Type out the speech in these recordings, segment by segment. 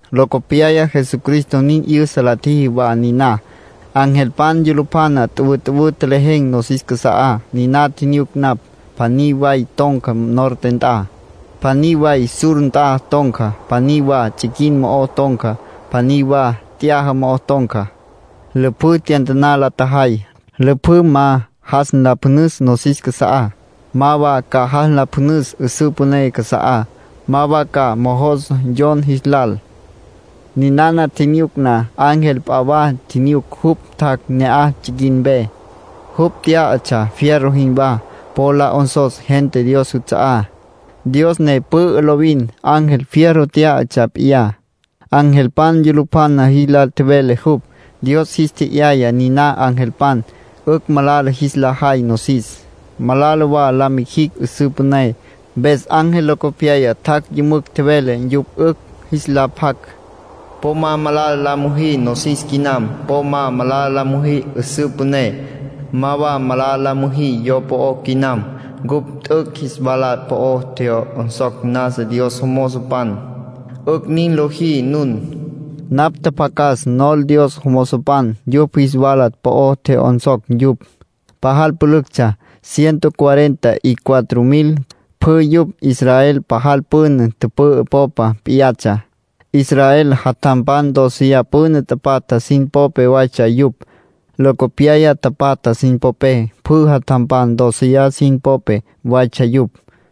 Locopyaya Jesucristo nin 'yüsa la tjiji wa niná. Angelpan yulupjana tüwütüwǘ tjelejen̈ nosis casa'á, niná tjinyuc napj. Pjaní way ton̈ca norte nt'a, pjaní way sur nt'a ton̈ca, pjaní wa tsiquin mo'o ton̈ca, pjaní wa t'yaja mo'o ton̈ca. Lüpjǘ tyantaná la tjajay, lüpjǘ ma jas nlapjünüs nosis casa'á, ma wa ca jas nlapjünüs 'üsǘ püné casa'á, ma wa ca mojos yon jis lal. Ninana tjinyuc na, ángel p'a wa tjinyuc. Jupj tjac' ne'aj tsiquin mpe. Jupj tyá'atsja fierro jinwá, po'o la 'onsos gentá Dios juts'a'á, Dios ne pü'ü lovin. Ángel fierro tyá'atsja p'iyá, angelpan yulupjana jis lal tjevele jupj. Dios jis tje'yaya niná angelpan 'ücj malala jis la jay nosis, malala wa la mijicj 'üsǘ püné. Mpes ángel locopyaya tjac' yümücj tjevele yupj 'ücj jis la pjac: “Po ma malala la müjí nosis quinam. Po ma malala la müjí 'üsǘ püné, ma wa malala la müjí yo po'ó quinam. Cupj t'üc' jis wala po'o tje'yonsocj nasa Dios jomozopan, 'ücj nin lojí nun”, tjevele jupj. Napj tjapjacas nol Dios jomozopan yupj jis wala po'o tje'yonsocj yupj. Pajal pülüctsja, ciento cuarenta y cuatro mil. Pjü yupj Israel pajal püna tüpü'ü popa p'iyatsja. Israel jatjampan dóceya püna tapatja sin popé waytsja yupj, locopyaya tapatja sin popé. Pjü jatjampan dóceya sin popé waytsja yupj.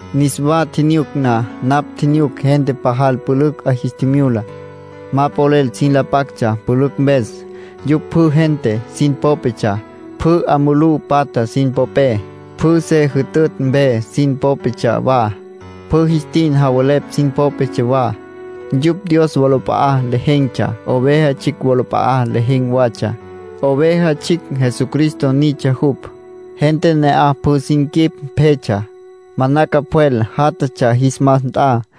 Niswa tjinyuc na, napj tjinyuc gente pajal pülücj 'a jis tjimyula. Ma polel sin la pactsja pülücj mpes. Yupj pjü gente sin popetsja, pjü 'a mulú patja sin popé, pjü se jütütj mpe sin popetsja wa, pjü jis tin javelepj sin popetsja wa. Yupj Dios wolap'a'a lejen̈tsja. Oveja Tsjicj wolap'a'a lejen̈ watsja. Oveja Tsjicj Jesucristo nitsja jupj. Gente ne'aj pjü sin quip pjetsja. Manaca pjwel jatatsja jis mas nt'a.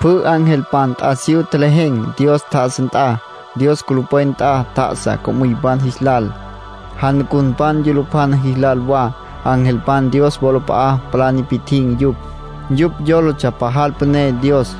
Pjü angelpan t'asiyú tjelejen̈ Dios tjá'asa nt'a. Dios culupwen nt'a tjá'asa co'müypan jis lal, janucunpan yulupjana jis lal wa. Angelpan Dios wolap'a'a palá nipi'tjin̈ yupj. Yupj yólatsja pajal püné Dios.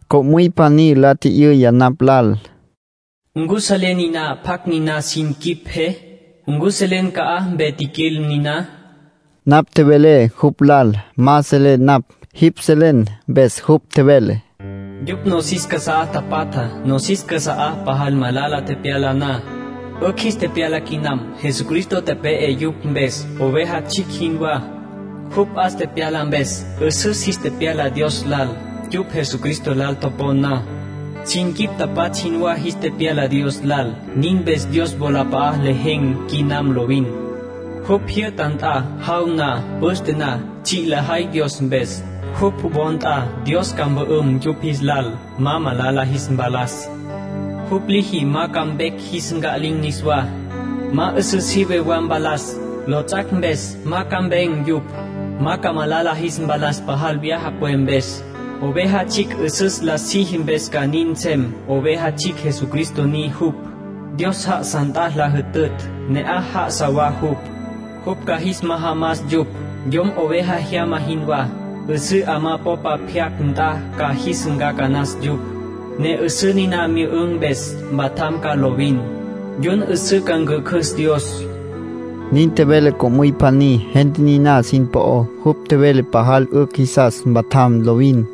Co'müy pjaní la tji'yüya napj lal: —¿Ncu selen niná pjacj niná sin quip pje? ¿Ncu selen ca'aj mpe tjiquil niná? Napj tjevelé jupj lal: —Ma selé napj. Jipj selen. Mpes jupj tjevele: —Yupj nosis casá tapatjá, nosis casa'á pajal malala tepyala na. 'Ücj jis tepyala quinam. Jesucristo tepe'e yupj mpes, oveja tsjicj jinwá. Jupj 'as tepyala mpes, 'üsüs jis tepyala Dios lal. Yupj Jesucristo lal topon na, sin quip tapatsj jinwá jis tepyala Dios lal. Nin mpes ‘Dios wolap'a'a lejen̈ quinam lovin, jupj jyü'ta nt'a. Jaw na, püste na, tsji' lajay Dios mpes, jupj wo nt'a. Dios ca mpü'üm yupj jis lal, ma malala jis mpalas. Jupj liji ma ca vecj jis nca'lin̈ niswá, ma 'üsǘ sive wa mpalas. Lots'ac' mpes ma ca mpen̈ yupj. Ma ca malala jis mpalas pajal vyaja pwe mpes. Oveja Tsjicj 'üsüs la siji mpes ca nin nsem. Oveja Tsjicj Jesucristo ni jupj. Dios já'asa nt'a la jütütj, ne'aj já'asa wa jupj. Jupj ca jis majamas yupj, yom oveja jyama jinwá. 'Üsǘ 'amá popa pyaca nt'a ca jis ncacanas yupj, ne 'üsǘ niná myü'ün̈ mpes, mpatjam ca lovin. Yun 'üsǘ ca ncjücjüs Dios.’ —Nin tjevele co'müy pjaní, gente niná sin po'ó. Jupj tjevele pajal 'ücj jisas mpatjam lovin.